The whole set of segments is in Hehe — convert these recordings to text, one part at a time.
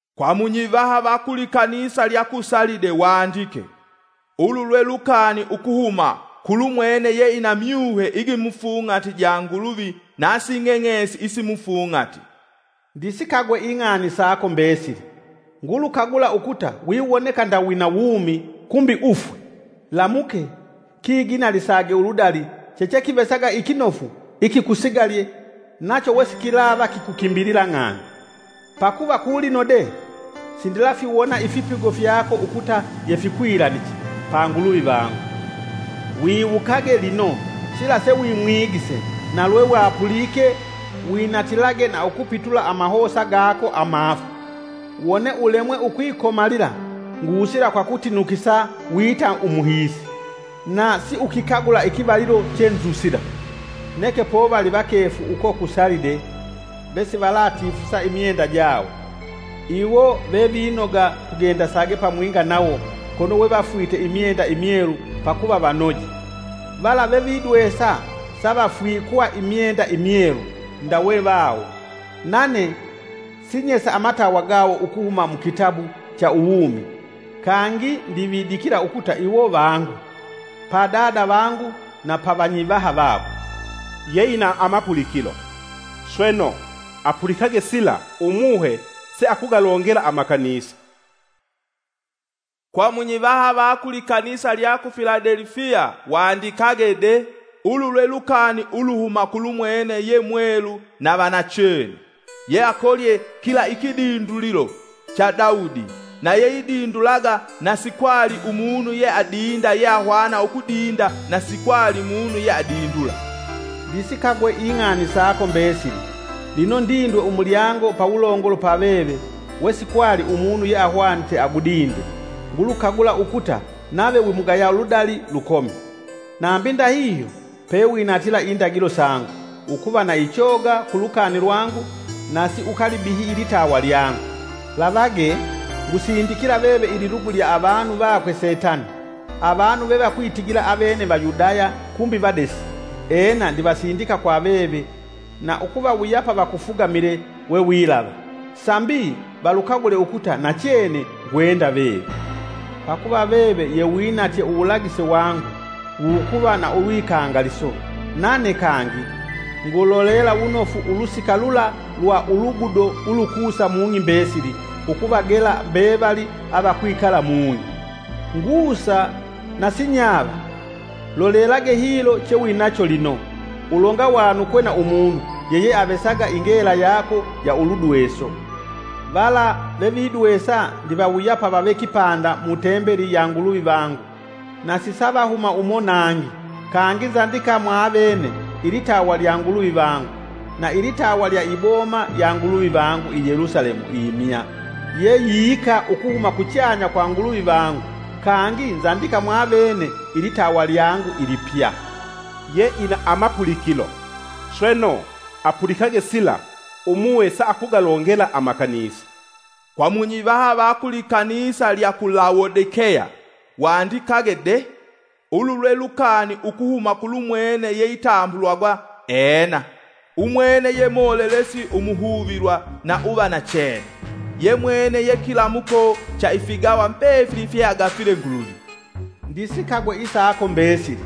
“Kwa munyivaha va ku likanisa lya ku Salide wandike: Ulu lwe lukani ukuhuma kulumwene yeina myuhe igimufung'ati ja Nguluvi nasi ng'eng'esi isimufung'ati. Ndisikagwe ing'ani sako mbesili; ngulukagula ukuta wiwoneka nda wina wumi kumbi ufwe! Lamuke! Kiginalisage uludali chechekivesaga ikinofu ikikusigalye nacho wesikilava kikukimbila ng'ani. Pakuva, kulino de, sindilafiwona ifipigo fyako ukuta yefikwilaniche pa Nguluvi vangu. Wiwukage, lino, sila sewimwigise na lwewapulike, winatilage na ukupitula amahosa gako amafu. Wone ulemwe ukwikomalila ngusila kwa kutinukisa wita umuhiisi, na siukikagula ikivalilo chenzusila. Neke povali vakefu uko ku Salide vesivalatifusa imyenda jawo. Iwo vevinoga tugendasage pamwinga nawo kono wevafwite imyenda imyelu pakuva vanoje. “Vala vevidwesa, savafwikwa imyenda imyelu ndawe vawo. Nane sinyesa amatawa gawo ukuhuma mukitabu cha uwumi. Kangi ndividikila ukuta iwo vangu pa Dada vangu na pa Vanyivaha vakwe. “Yeina amapulikilo, Sweno, apulikage sila umuhe se akugalongela amakanisa! “Kwa munyivaha va ku likanisa lya ku Filadelifiya wandikage de: Ulu lwe lukani uluhuma kulumwene ye mwelu na va nachene, yeakolye kila ikidindulilo cha Daudi, na yeidindulaga na sikwali umunu ye adinda yeahwana ukudinda na si kwali umunu ye adindula. Ndisikagwe ing'ani sako mbesili! Lino, ndindwe umulyango pawulongolo pa veve wesikwali umunu yeahwanite agudinde; ngulukagula ukuta nave wimugaya ludali lukomi, nambi ndahihyo, pewinatila indagilo sangu, ukuva na ichoga ku lukani lwangu na siukalibihyi ilitawa lyangu. Lavagee! Ngusindikila veve ililugu lya avanu vakwe Setani, avanu vevakwitigila avene Vayudaya kumbi vadesi. Ena, ndivasindika kwa veve na ukuvawuyapa vakufugamile wewilava, sambi valukagule ukuta nachene ngwenda veve. Pakuva veve yewinatye uwulagise wangu wukuva na ulwikangaliso, nane kangi ngulolela wunofu ulusika lula lwa ulugudo ulukusa mung'i mbesili ukuvagela mbevali avakwikala mung'i. Ngusa na sinyava! Lolelage hilo, chewinacho lino, ulonga wanukwe na umunu yeyeavesaga ingela yako ya uludweso. “Vala vevidwesa ndivawuyapa vave kipanda mu Tembeli ya Nguluvi vangu, na sisavahuma umo nangi. Kangi nzandika mwavene ilitawa lya Nguluvi vangu, na ilitawa lya iboma ya Nguluvi vangu, i Yelusalemu imya, ye yiika ukuhuma kuchanya kwa Nguluvi vangu. Kangi nzandika mwavene ilitawa lyangu ilipya. “Yeina amapulikilo, sweno apulikage sila Umuhe se akugalongela amakanisa! “Kwa munyivaha va ku likanisa lya ku Lawodikeya wandikage de: Ulu lwe lukani ukuhuma kulumwene yeitambulwagwa, ‘Ena.’ Umwene ye molelesi umuhuvilwa na uva nachene, yemwene yekilamuko cha ifigawa mbefili fyeagafile Nguluvi. Ndisikagwe isako mbesili!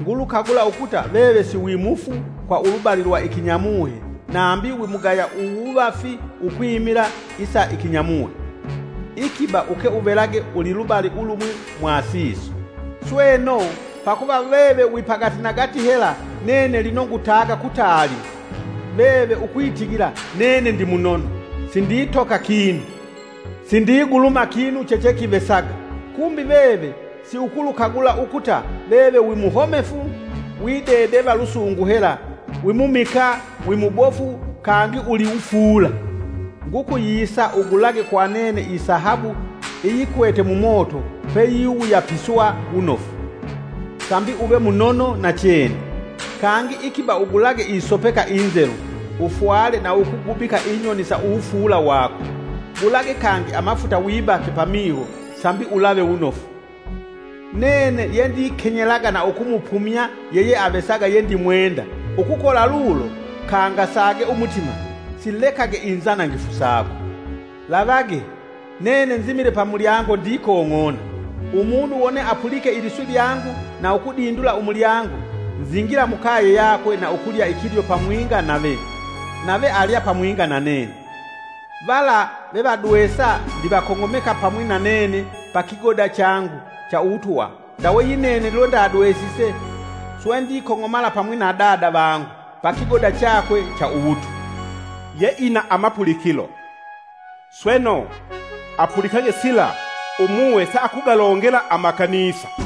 Ngulukagula ukuta veve si mufu kwa ulubali lwa ikinyamuhe nambi wimugaya uwuvafi ukwimila isa ikinyamuhe. Ikiba uke uvelage ulilubali ulumwi mwa siso. Sweno, pakuva veve wipagatinagati hela nene lino ngutaga kutaali! Veve ukwitigila, ‘Nene ndi munono; sinditoka kinu, sindiguluma kinu chechekivesaga.’ Kumbi, veve siukulukagula ukuta veve wi muhomefu, widedeva lusungu hela, wimumikaa, wimubofu kangi uliwufuula! Ngukuyisa ugulage kwa nene isahabu iyikwete mumoto peyiwuyapiswa wunofu sambi uve munono nachene. Kangi ikiba ugulage isopeka inzelu, ufwale na ukugubika inyoni sa uwufuula wako. Gulage kangi amafuta wibake pamiho sambi ulave wunofu. Nene yendikenyelaga na ukumupumya yeyeavesaga yendimwenda. Ukukola lulo kangasage umutima, silekage inzanangifu sako. Lavage! Nene nzimile pamulyango ndikong'ona. Umunu wone apulike iliswi lyangu na ukudindula umulyango, nzingila mukaye yakwe na ukulya ikilyo pamwinga nave, nave alya pamwinga na nene. “Vala vevadwesa ndivakong'omeka pamwi nanene pa kigoda changu cha uwutwa, ndawe yinene lwendadwesise swe ndikong'omala pamwi na Dada vangu pa kigoda chakwe cha uwutwa. “Yeina amapulikilo, sweno apulikage sila Umuhe se akugalongela amakanisa!”